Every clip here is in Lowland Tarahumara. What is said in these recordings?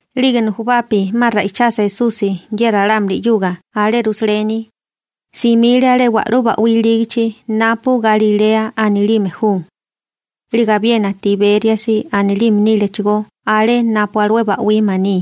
'Lige nujubapi 'ma ra'ichasa Esusi ye ralámuli 'yuga alé Rusaleni, simile alé wa'lú ba'wí ilígichi napu Galilea anilime ju. 'Lige abiena Tibériasi anilime nílechigó alé napu alué ba'wí maní.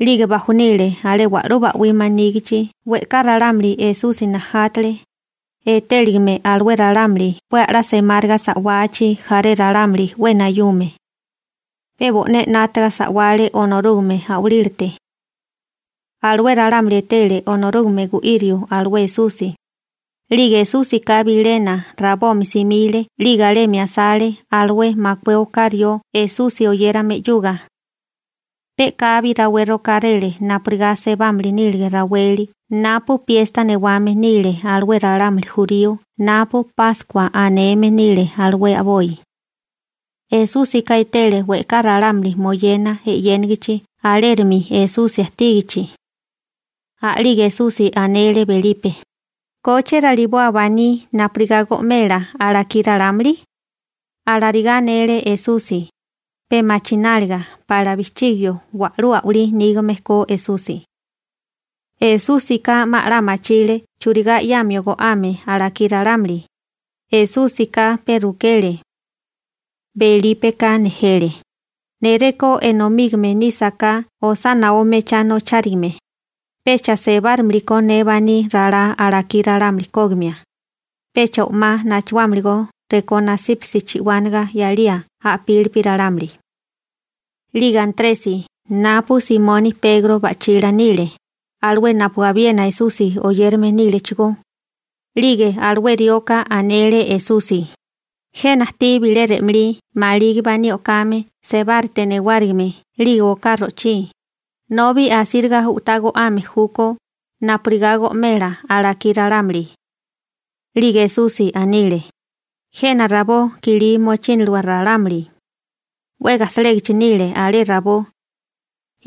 'Lige bajonile alé wa'lú ba'wí manígichi. We'ká ralámuli Esusi najátale, etéligame alué ralámuli 'we a'lá semáriga sa'wachi jaré ralámuli 'we nayume. Pe bo'né 'nátaga sa'wale Onorúgame a'walílate. Alué ralámuli etele Onorúgame gu'írio alué Esusi. 'Lige Esúsika bilena rabomi simile 'lige alemi asale alué makué oká rió Esusi oyérame 'yuga. Pe u'kabi rawé rokáréle napurigá sebámili nílige raweli napu piesta newame nile alué ralámuli jurío napu Páskua aneme nile alué a'boi. Esúsika etele we'ká ralámuli moyena e'yénigichi alérimi Esusi ajtígichi. A'lige Esusi anele Belipe: ―¿Koche raliboa baní napurigá go'mela alakí ralámuli? Alarigá anele Esusi, pe machináliga pa'lá bijchigio wa'lú a'walí nígame ko Esusi. Esúsika 'ma 'la machile churigá 'yamio go'ame alakí ralámuli, Esúsika pe rukele. Belípeka nejele: ―Ne, rekó enomígame nísaká osá naó mechá nochárigame, pecha sebárimilikó ne baní ralá alakí ralámuli kógimia, pecha o'má nachuámiligó rekó nasípasi chi'wánaga 'yalía a'pílipi ralámuli. 'Lige Antresi, napu Simoni Pegro ba'chila nile, alué napu abiena Esusi oyérame nílechigó, 'lige alué rioka anele Esusi: ―Jena ajtí bilé re'malí maligi baní o'kame sebárate newárigime 'lige oká ro'chí, nobi asíriga u'tá go'ame júkó napurigá go'mela alakí ralámuli. 'Lige Esusi anile: ―Jena rabó kilí mochíniliwa ralámuli. 'We gajsalégichi nile alé rabó.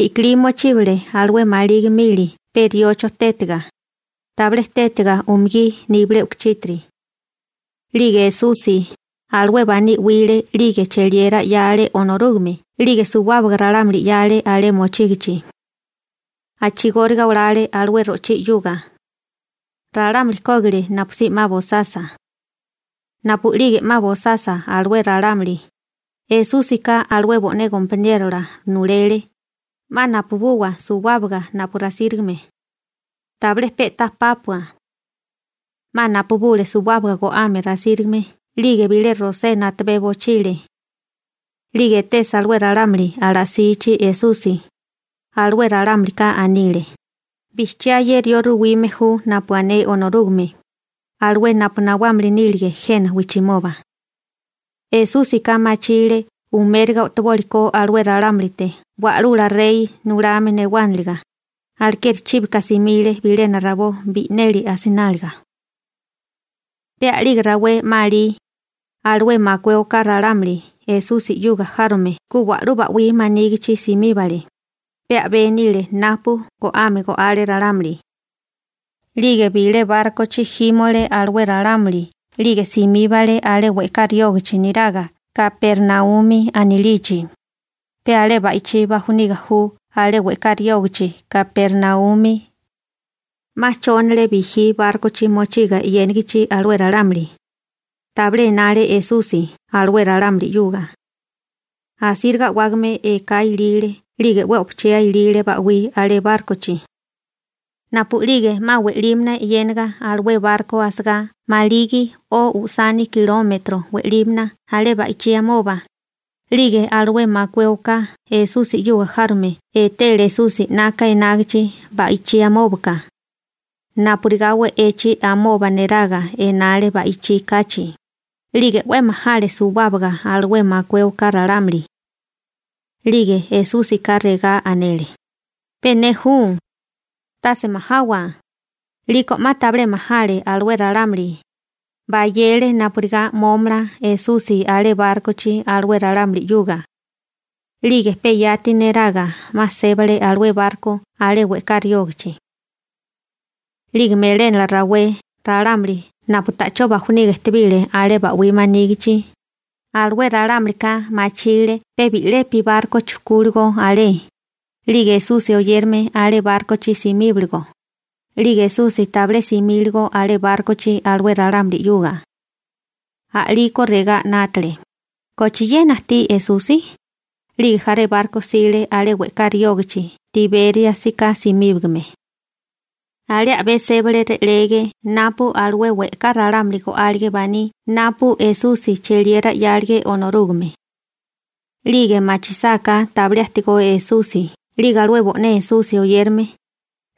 I'kilí mochíbale alué maligi mili pe riocho tétiga, tabilé tétiga umugí nibilé u'kuchítiri. 'Lige Esusi alué baní 'wile 'lige cheliera 'yale Onorúgame 'lige suwábaga ralámuli 'yale alé mochígichi. A'chigóriga olale alué ro'chí 'yuga. Ralámuli kógile napusí 'ma bosasa. Napu'lige 'ma bosasa alué ralámuli, Esúsika alué bo'né gompaniérola nulele: ―'Ma napubuwa suwábaga napu rasírigame. Tabilé pe'tá pápua. 'Ma napubule suwábaga go'ame rasírigame 'lige bilé rosena a'tabé bochile. 'Lige etesa alué ralámuli ala'sichi Esusi, alué ralámulika anile: ―Bijchiá ye rió ruwime ju napu ané Onorúgame, alué napu nawámili nílige jena wijchimoba. Esúsika machile umériga o'toboli ko alué ralámulite wa'lula rey nulame newániliga, alekeri chíbika simile bilena rabó bi'neli asináliga. Pe a'lige rawé 'ma alí, alué makué oká ralámuli Esusi 'yuga járome ku wa'lú ba'wí manígichi simíbale, pe a'bé nile napu go'ame go'ale ralámuli. 'Lige bilé bárkochi jímole alué ralámuli 'lige simíbale alé we'ká riógichi niraga Kapernaumi anilichi, pe alé ba'ichí bajuniga ju alé we'ká riógichi Kapernaumi. 'Ma chónale bijí bárkochi mochiga e'yénigichi alué ralámuli. Tabilé enale Esusi alué ralámuli 'yuga. Asíriga a'wágame eká ilile 'lige 'we o'pochía ilile ba'wí alé bárkochi. Napu'lige 'ma we'límana e'yénaga alué barko asagá maligi o usani kilómetro we'límana alé ba'ichí amoba, 'lige alué makué oká Esusi 'yuga járome etele Esusi 'naka enágichi ba'ichí amóbaka, napurigá we'echi amoba neraga enale ba'ichí kachi, 'lige 'we majale suwábaga alué makué oká ralámuli. 'Lige Esúsika regá anele: ―Pe ne ju, tase majawa. 'Liko 'ma tabilé majale alué ralámuli, bayele napurigá mómala Esusi alé bárkochi alué ralámuli 'yuga. 'Lige pe yati neraga 'ma sébale alué barko alé we'ká riógichi. 'Lige melénala rawé ralámuli napu ta'chó bajuniga ejtebile alé ba'wí manígichi, alué ralámulika machile pe bi'lepi barko chujkúligo alé, 'lige Esusi oyérame alé bárkochi simíboligo, 'lige Esusi tabilé simíligo alé bárkochi alué ralámuli 'yuga. A'liko regá 'nátale: «¿Kochiena ajtí Esusi?» 'Lige jaré barko jsile alé we'ká riógichi Tibériasika simíbigame. Alé a'bé sébale re'lege napu alué we'ká ralámuli go'álige baní napu Esusi cheliera 'yálige Onorúgame. 'Lige machisáká tabilé ajtigó Esusi 'lige alué bo'né Esusi oyérame,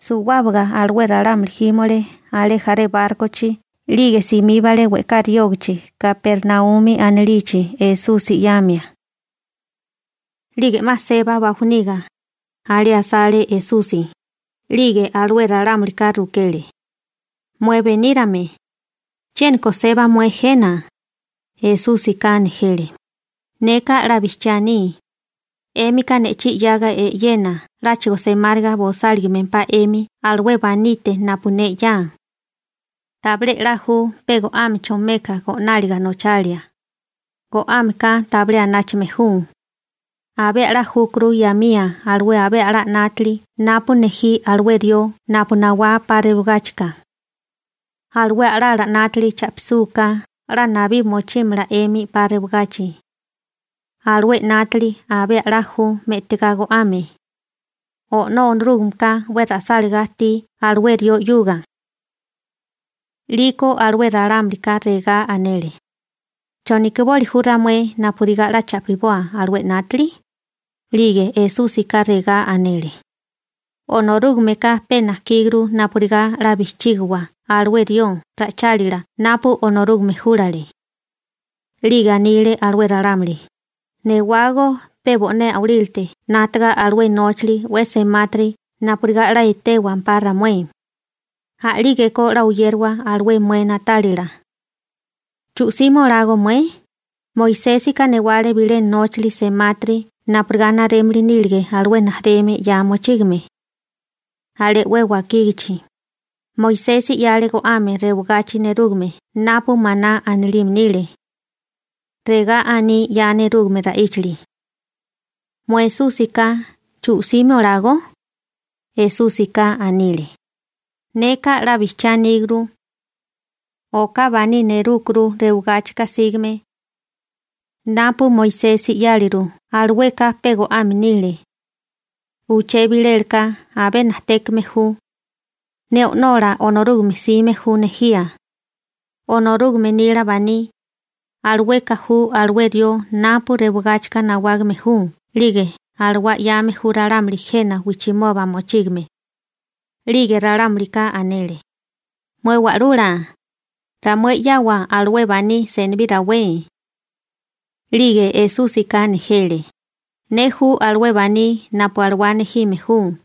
suwábaga alué ralámuli jímole alé jaré bárkochi 'lige simíbale we'ká riógachi Kapernaumi anilichi Esusi 'yamia. 'Lige 'ma seba bajuniga, alé asale Esusi, 'lige alué ralámulika rukele: ―Mué benírame, ¿chiéniko seba mué jena? Esúsika nejele: ―Neka 'la bijchiá aní, 'émika ne'chí 'yaga e'yena 'láchigo semáriga bosáligimempá 'emi alué banite napu ne 'ya. Tabilé 'la ju pe go'ámecho meka go'náliga nochalia. Go'ámeka tabilé anáchame ju. Abé a'lá júkuru 'yamía alué abé a'lá 'nátili napu nejí alué rió napu nawá 'pa rewagáchika. Alué a'lala 'nátili cha'pisúká 'la nabí mochímala 'emi 'pa rewagachi. Alué 'nátili abé a'lá ju me'tigá go'ame. O'nó Onorúgameka 'we ra'sáligá ajtí alué rió 'yuga. 'Liko alué ralámulika regá anele: ―¿Chonikiboli ju ramué napurigá 'la cha'piboa alué 'nátili? 'Lige Esúsika regá anele: ―Onorúgameka pe najkíguru napurigá 'la bijchígiwa alué rió ra'ichálila napu Onorúgame júlale. 'Lige anile alué ralámuli: ―Newágó pe bo'né a'walílate 'nátaga alué nóchali 'we semátiri napurigá 'la etéwampá ramué. A'lígeko 'la oyériwa alué mué na'tálila. ¿Chu'simi olágó mué? Moisésika newale bilé nóchali semátiri napurigá narémili nílige alué rijimala 'ya mochígame. Alé 'we wakígichi, Moisesi 'yale go'ame rewagachi nerúgame napu maná anilime nile. Regá aní 'ya nerúgame ra'íchali. Mué Esúsika, ¿chu'simi olágó? Esúsika anile: ―Neka 'la bijchiá aníguru. Oká baní nerúkuru rewigáchika sígame. Napu Moisesi 'yáleru alueka pe go'ame nile. Uché bilélaka abé najtékame ju. Ne O'nola Onorúgame 'sime ju nejía. Onorúgame nila baní, alueka ju alué rió napu rewagáchika nawágame ju 'lige alawá 'yame ju ralámuli jena wijchimoba mochígame. 'Lige ralámulika anele: ―Mué Wa'lula, ramué 'yawa alué baní senibí rawé. 'Lige Esúsika nejele: ―Ne ju alué baní napu alawá nejime ju.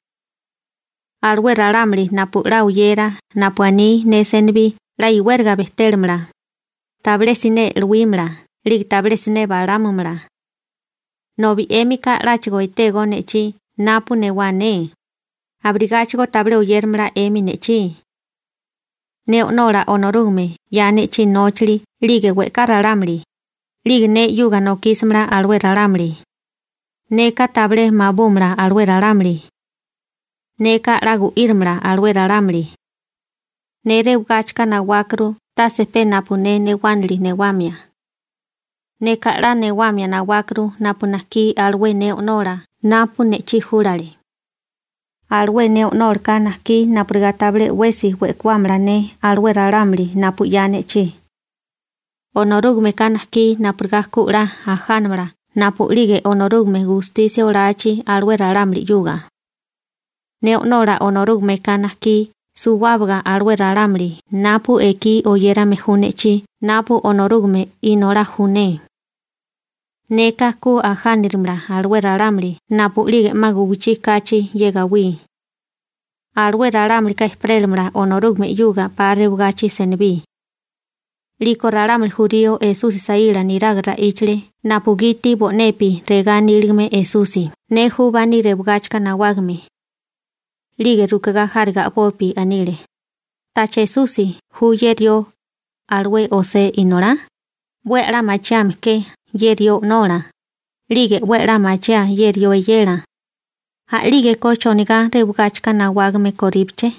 Alué ralámuli napu 'la oyera napu aní ne senibí 'la iwériga bejtélamala, tabilé siné e'luímala 'lige tabilé siné balámumala. Nobi 'émika 'láchigo etégó ne'chí napu newá ne, abirigáchigo tabilé oyéramala 'emi ne'chí. Ne O'nola Onorúgame 'ya ne'chí nóchali 'lige we'ká ralámuli, 'lige ne 'yuga nokísamala alué ralámuli. Neka tabilé mabúmala alué ralámuli. Neka 'la gu'írimala alué ralámuli. Ne rewigáchika nawákuru tase pe napu ne newánili newamia. Neka 'la newamia nawákuru napu najkí alué ne O'nola napu ne'chí júlale. Alué ne O'nólaka najkí napurigá tabilé 'wesi we'kuámala ne alué ralámuli napu 'ya ne'chí. Onorúgameka najkí napurigá ku 'la ajánamala napu'lige Onorúgame gustisia olachi alué ralámuli. Ne O'nola Onorúgameka najkí suwábaga alué ralámuli napu ekí oyérame ju ne'chí napu Onorúgame Inolá ju ne. Neka ku ajánirimala alué ralámuli napu'lige 'ma guwichí kachi ye gawí. Alué ralámulika ejperélamala Onorúgame 'yuga 'pa rewagachi senibí. 'Liko ralámuli jurío Esusi saíla neraga ra'íchale napugiti bo'nepi regá aníligame Esusi: «Ne ju baní rewigáchika nawágame.» 'Lige rukigá járiga a'bopi anile: ―¿Tacha Esusi ju ye rió, alué José inolá? 'We a'lá machiame ke ye rió o'nola, 'lige 'we a'lá machiáa ye rió eyela. A'lígeko ¿chonigá rewigáchika nawágame koríbeché?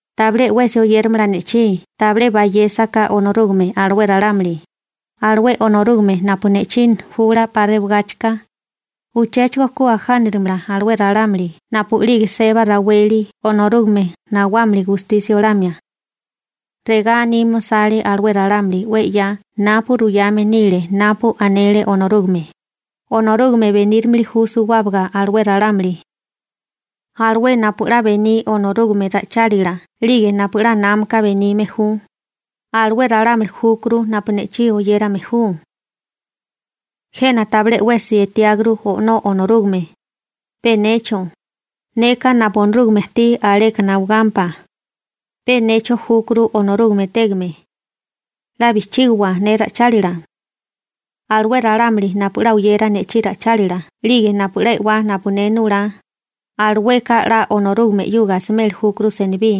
Tabilé 'wesi oyéramala ne'chí tabilé bayésaká Onorúgame alué ralámuli, alué Onorúgame napu ne'chí jula 'pa rewagáchika, uchéchigo ku ajánirimala alué ralámuli napu'lige seba raweli Onorúgame nawámili gustisia olamia ralámuli. Regá anime osale alué ralámuli 'we 'ya napu ruyame nile napu anele Onorúgame: «Onorúgame benírimili ju suwábaga alué ralámuli.» Alué napu 'la bení Onorúgame ra'ichálila 'lige napu 'la námaka benime ju, alué ralámuli júkuru napu ne'chí oyérame ju. › Jena tabilé 'wesi etiáguru O'nó Onorúgame, pe necho, neka napu Onorúgame ajtí aleka nawagámpá. Pe necho júkuru Onorúgame etégame. 'La bijchígowa ne ra'ichálila. Alué ralámuli napu 'la oyera ne'chí ra'ichálila 'lige napu 'la e'wá napu ne nulá, alueka 'la Onorúgame 'yuga asimeli júkuru senibí.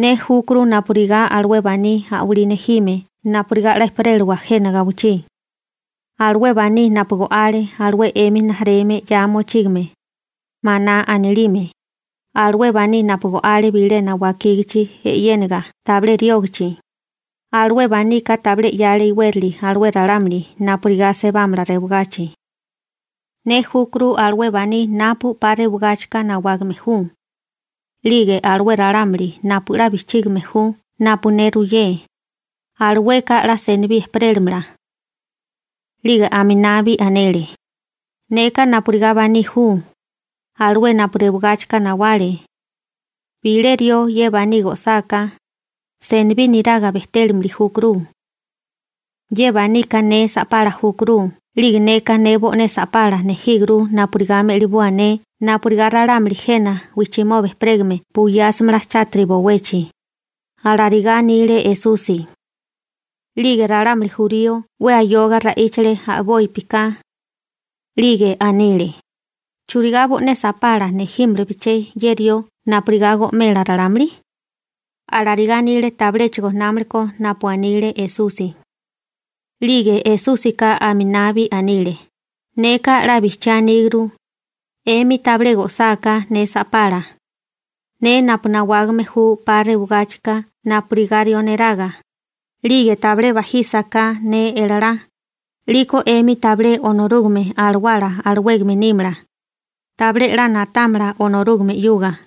Ne júkuru napurigá alué baní a'walí nejime napurigá 'la ejperélawa jena gawichí. Alué baní napu go'ale alué 'emi rijimala 'ya mochígame, maná anilime, alué baní napu go'ale bilena wakígichi e'yéniga tabilé riógichi, alué banika tabilé 'yale iwérali alué ralámuli napurigá sebámala rewagachi. Ne júkuru alué baní napu 'pa rewagáchika nawágame ju, 'lige alué ralámuli napu 'la bijchígime ju napu ne ruyé, alueka 'la senibí ejperélamala. 'Lige aminabi anele: ―Neka napurigá baní ju, alué napu rewigáchika nawale. Bilé rió ye baní go'sáká, senibí niraga bejtélimili júkuru. Ye banika ne sa'pala júkuru 'lige neka ne bo'né sa'pala nejíguru napurigá me'liboa ne napurigá ralámuli jena wijchimoba ejperégame buyásimala chátiri bowechi ―alarigá anile Esusi. 'Lige ralámuli jurío 'we ayoga ra'íchale a'bópika. 'Lige anile: ―¿Churigá bo'né sa'pala nejímalabeché ye rió napurigá go'mela ralámuli? Alarigá anile tabiléchigo námalakó napu anile Esusi. 'Lige Esúsika aminabi anile: ―Neka 'la bijchiá aníguru, 'emi tabilé go'sáká ne sa'pala, ne napu nawágame ju 'pa rewagáchika napurigá rió neraga, 'lige tabilé bajísaká ne elalá, 'liko 'emi tabilé Onorúgame Alawala alawégame nímala. Tabilé 'la na'támala Onorúgame 'yuga.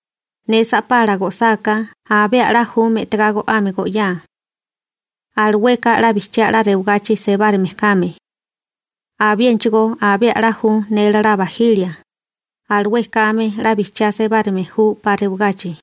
Ne sa'pala go'sáká abé a'lá ju me'tagá go'ame go'yáa. Alueka 'la bijchiá 'la rewagachi sebárime kame. Abiénachigó abé a'lá ju ne elalá bajilia, alué kame 'la bijchiá sebárime ju 'pa rewagachi.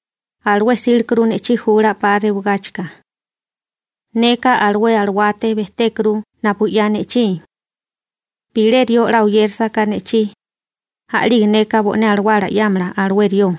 O'nó Onorúgame júkuru alawá nejime, alué 'sílekuru ne'chí jula 'pa rewagáchika. Neka alué alawálate bejtékuru napu 'ya ne'chí. Bilé rió 'la oyérasaká ne'chí, a'lige neka bo'né alawala 'yámala alué rió.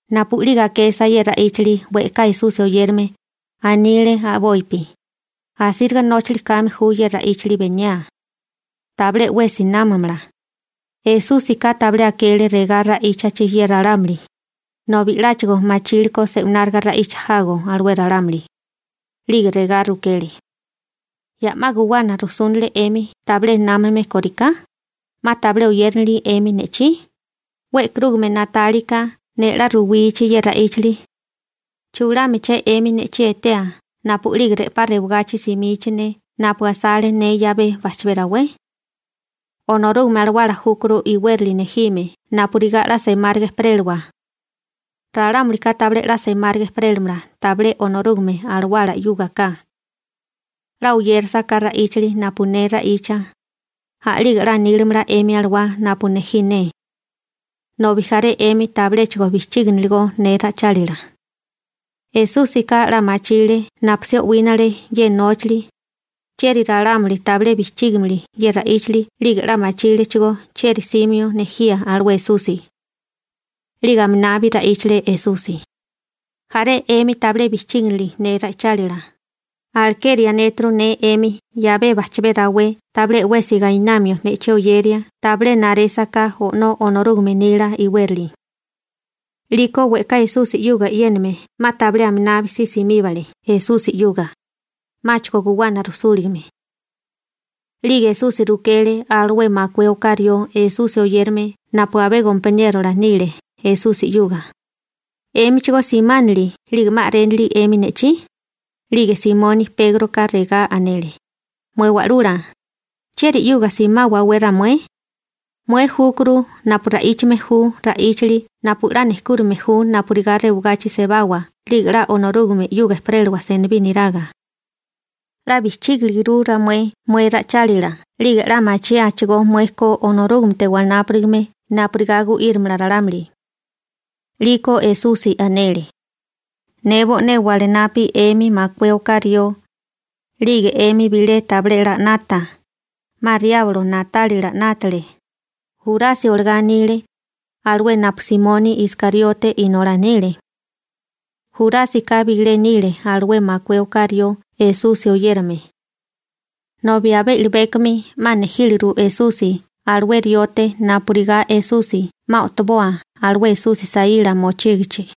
Napu'lige akesa ye ra'íchali we'ká Esusi oyérame, anile a'bopi: ―Asíriga nóchali kame ju ye ra'íchali beniaa. Tabilé 'wesi námamala. Esúsika tabilé akele regá ra'íchachi ye ralámuli, nobi 'láchigo machíleko se'wináriga ra'icha jago alué ralámuli, 'lige regá rukele: ―¿Ya 'ma guwana rujsúnale 'emi tabilé námame kóriká? ¿'Ma tabilé oyéranili 'emi ne'chí? 'We e'karúgame na'tálika ne 'la ruwichi ye ra'íchali, ¿chulámalaché 'emi ne'chí etea napu'lige re'pá rewagachi simichi ne napu asale ne 'yabé bajchabé rawé? Onorúgame Alawala júkuru iwérali nejime napurigá 'la semáriga ejperélawa. Ralámulika tabilé 'la semáriga ejperélamala tabilé Onorúgame Alawala 'yúgaká. 'La oyérasaká ra'íchali napu ne ra'icha, a'lige 'la nílamala 'emi alawá napu nejí ne. Nobi jaré 'emi tabiléchigo bijchíginiligó ne ra'ichálila. Esúsika 'la machile napusí o'wínale ye nóchali, chieri ralámuli tabilé bijchígimili ye ra'íchali 'lige 'la machílechigó chieri 'símio nejía alué Esusi. 'Lige aminabi ra'íchale Esusi: ―Jaré 'emi tabilé bijchíginili ne ra'ichálila, alekeri anéturu ne 'emi 'yabé bajchabé rawé tabilé 'wesi gainamio ne'chí oyeria tabilé narésaká O'nó Onorúgame nila iwérali. 'Liko we'ká Esusi 'yuga e'yéname 'ma tabilé aminabi si simíbale Esusi 'yuga, 'máchigo guwana rujsúligame. 'Lige Esusi rukele alué makué oká rió Esusi oyérame napu abé gompaniérola nile Esusi 'yuga: ―¿'Émichigó simánili 'lige 'ma a'rénili 'emi ne'chí? 'Lige Simoni Pégroka regá anele: ―Mué Wa'lula, ¿chieri 'yuga simáwawé ramué? Mué júkuru napu ra'íchame ju ra'íchali napu 'la nejkúrame ju napurigá rewagachi sebawa 'lige 'la Onorúgame 'yuga ejperélewa senibí niraga. 'La bijchígiliguru ramué mué ra'ichálila 'lige 'la machiáachigó mué ko Onorúgamete wanápurigame napurigá gu'írimala ralámuli. 'Liko Esusi anele: ―Ne bo'né wanapa 'emi makué oká rió, 'lige 'emi bilé tabilé 'la 'nata, ¡'ma riablo na'tálila 'nátale! Jurasi olagá anile, alué napu Simoni Iskariote inolá nile. Jurásika bilé nile alué makué oká rió Esusi oyérame, nobi abé i'libékomi 'ma nejíliru Esusi alué riote napurigá Esusi 'ma o'toboa alué Esusi saíla mochígichi.